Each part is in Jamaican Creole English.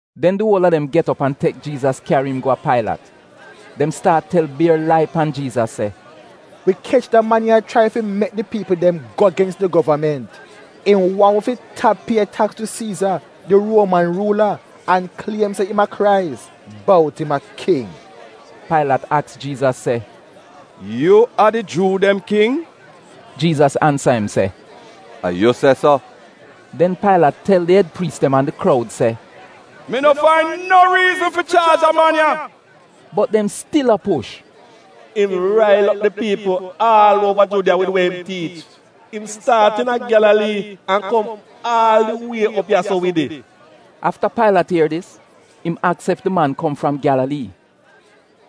Den di uol a dem get op an tek Jiizas kyari im go a Pailat. Dem staat tel bier lai pan Jiizas se, “Wi kech da man ya a chrai fi mek di piipl dem go gens di govament. Im waahn wi fi tap pie taks tu Siiza di Ruoman ruula an kliem se im a Krais — bout im a King.” Pailat aks Jiizas se, “Yu a di Juu dem king?” Jiizas ansa im se, “A yu se so.” Den Pailat tel di ed priis dem an di kroud se, “Mi no fain no riizn fi chaaj da man ya.” Bot dem stil a push, “Im rail op di piipl aal uova Judiya wid we im tiich. Im staat iina Gyalalii an kom aal di wie op ya-so wid it.” Afta Pailat ier dis, im aks ef di man kom fram Gyalalii.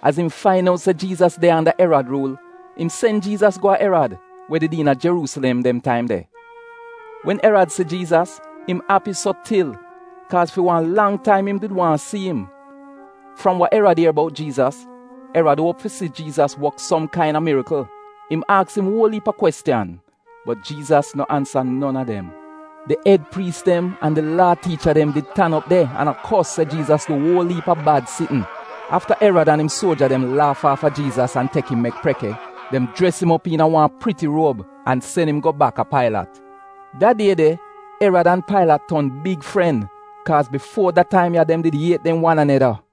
Az im fain out se Jiizas de anda Erad ruul, im sen Jiizas go a Erad, we did iina Jeruusilem dem taim de. Wen Erad si Jiizas, im api so til, kaaz fi wan lang taim im did waahn si im. Fram wa Erad ier bout Jiizas, Erad uop fi si Jiizas wok som kaina mirikl. Im aks im uol iip a kwestiyan, bot Jiizas no ansa non a dem. Di ed priis dem an di Laa tiicha dem did tan op de an a kos se Jiizas du uol iip a bad sitn. Afta Erad an im suoja dem laaf aafa Jiizas an tek im mek preke, dem jres im op iina wan priti ruob, an sen im go baka Pailat. Da die de Erad an Pailat ton big fren, kaaz bifuo da taim ya dem did iet dem wan aneda.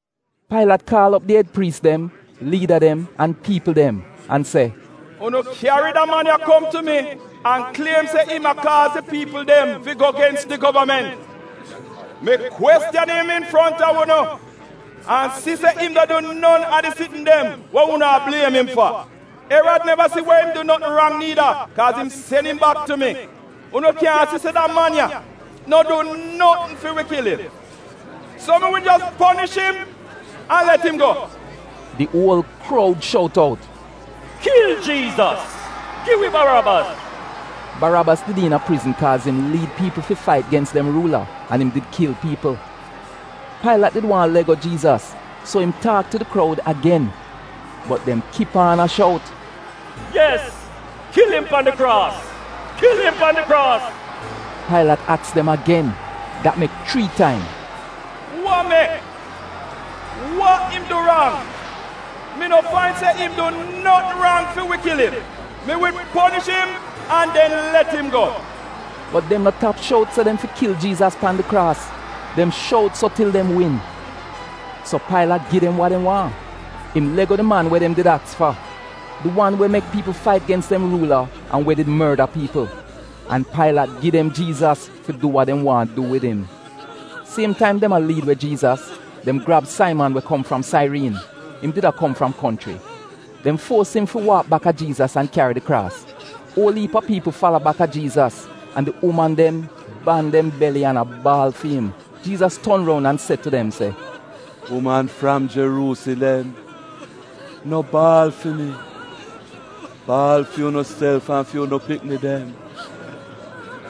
Pailat kaal op di ed priis dem, liida an piipl dem an se, “Unu kyari da man ya kom tu mi an kliem se im a kaaz di piipl dem fi go gens di govament. Mi kwestiyan im infronta unu an si se im no du non a di sitn dem we unu a bliem im fa. Erad neva si we im du notn rang niida, kaaz im sen im bak tu mi. Unu kyaahn si se da man ya no du notn fi wi kil im. So, mi wi jos ponish im an let im go.” Di uol kroud shout out, “Kil Jiizas! Gi wi Barabas!” (Barabas did iina prizn kaaz im liid piipl fi fait gens dem ruula, an im did kil piipl.) Pailat did waahn let go Jiizas, so im taak tu di kroud agen. Bot dem kip aan a shout, “Yes! Kil im pan di kraas! Kil im pan di kraas!” Pailat aks dem agen — dat mek chrii taim. “Wa mek? Wa im du rang? Mi no fain se im du notn rang fi wi kil im. Mi wi ponish im an den let im go.” Bot dem no tap shout out se dem fi kil Jiizas pan di kraas; dem shout so til dem win. So, Pailat gi dem wa dem waahn. Im let go di man we dem did aks fa. Di wan we did mek piipl fait gens dem ruula an we did morda piipl. An Pailat gi dem Jiizas fi du wa dem waahn du wid im. Siem taim dem a liid we Jiizas, dem grab Saiman we kom fram Sairiin, im did a kom fram konchri. Dem fuos im fi waak baka Jiizas an kyari di kraas. Uol iip a piipl fala baka Jiizas, an di uman dem ban dem beli an a baal fi im. Jiizas ton roun an se tu dem se, “Uman fram Jeruusilem, no baal fi mi. Baal fi unuself an fi unu pikni dem.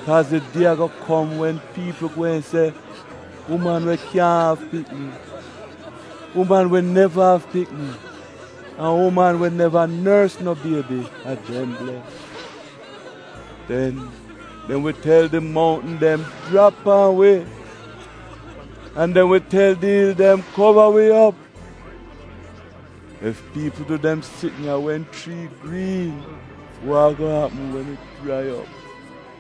Kaaz di die ago kom wen piipl gweehn se, ‘Uman we kyaahn av pikni, uman we neva av pikni an uman we neva nors no biebi — a dem bles!’ Den “ ‘dem wi tel di mountn dem, “Jrap pan wi!” an dem wi tel di il dem, “Kova wi op!” ’ Ef piipl du dem sitn ya wen chrii griin, wa ago apm wen it jrai op?”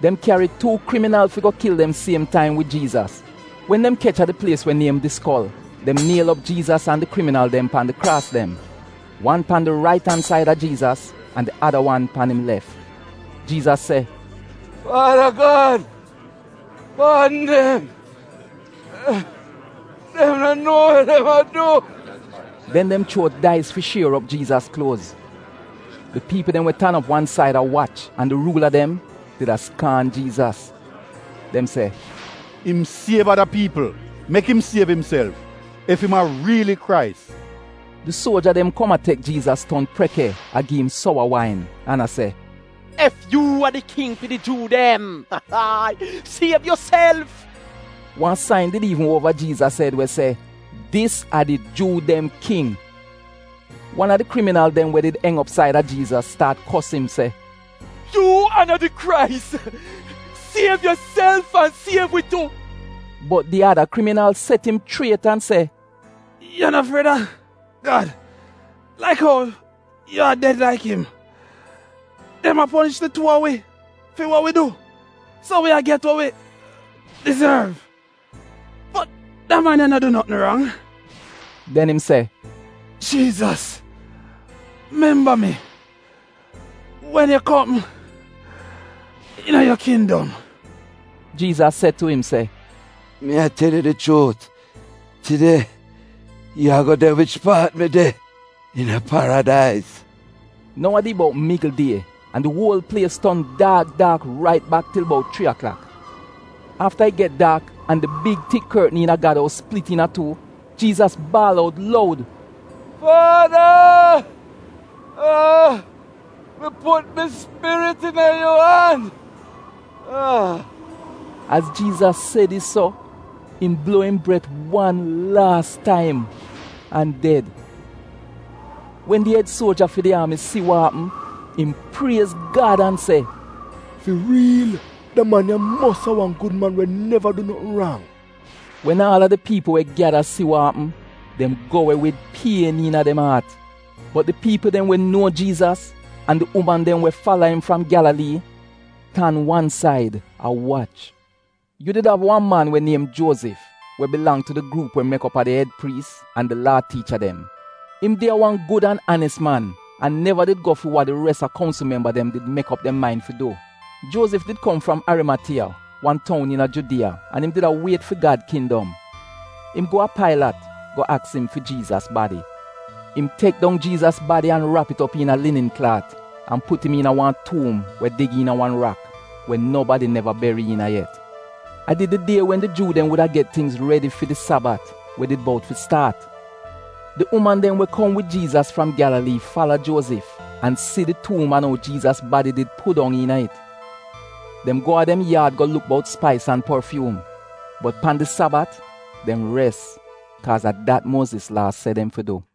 Dem kyari tuu kriminal fi go kil dem siem taim wid Jiizas. Wen dem kech a di plies we niem Di Skol, dem niel op Jiizas an di kriminal dem pan di kraas dem, wan pan di rait an said a Jiizas an di ada wan pan im lef. Jiizas se, “Faada Gad paadn dem, dem no nuo wa dem a du.” Den dem chuo dais fi shier op Jiizas kluoz. Di piipl dem we tan op wan said a wach an di ruula dem did a skaan Jiizas. Dem se, “Im siev ada piipl, mek im siev imself, ef im a riili Krais.” Di suoja dem kom a tek Jiizas ton preke a gi'im sowa wain an a se, “Ef yu a di King fi di Juu dem, siev yuself.” Wan sain did iivn uova Jiizas ed we se, “DIS A DI JUU DEM KING.” Wan a di kriminal dem we did eng op said a Jiizas, staat kos im se, “Yu a no di Krais? Siev yuself an siev wi tu!” Bot di ada kriminal set im chriet an se, “Yu no fried a Gad, laik ou yu a ded laik im? Dem a ponish di tuu a wi fi wa wi du, so wi a get wa wi dizorv. Bot da man ya no du notn rang.” Den im se, “Jiizas, memba mi wen yu kom iina yu kindom.” Jiizas se tu im se, “Mi a tel yu di chuut, tide yu ago de wich paat mi de iina Paradais.” Nou a di bout migl die, di uol plies ton daak daak rait bak til bout chrii aklak di iivnin. Afta it get daak, an di big tik kortn iina Gad ous plit iina tuu Jiizas baal out loud, “Faada, mi put mi spirit iina yu an.” Az Jiizas se dis so, im bluo im bret wan laas taim an ded. Wen di ed suoja fi di aami, si wa apm, im priez Gad an se, “Fi riil da man ya mos a wan gud man we neva du notn rang!” Wen aal a di piipl we gyada si wa apm, dem go we wid pien iina dem aat. Bot di piipl dem we nuo Jiizas, an di uman dem we fala im fram Gyalalii, tan wan said a wach. Yu did av wan man we niem Juozif, we bilang tu di gruup we mek op a di ed priis an di Laa tiicha dem. Im did a wan gud an anis man, an neva did go fi wa di res a kounsl memba dem did mek op dem main fi du. Juozif did kom fram Arimatiya, wan toun iina Judiya an im did a wiet fi Gad kindom. Im go a Pailat go aks im fi Jiizas badi. Im tek dong Jiizas badi an rap it op iina linin klaat an put im iina wan tuum we dig iina wan rak, we nobadi neva beri iina yet. A did di die wen di Juu dem wuda get tingz redi fi di Sabat we did bout fi staat. Di uman dem we kom wid Jiizas fram Gyalalii fala Juozif an si di tuum an ou Jiizas badi did pudong iina it. Den dem go a dem yaad go luk bout spais an porfyuum. Bot pan di Sabat, dem res kaaz a dat Muoziz Laa se dem fi du.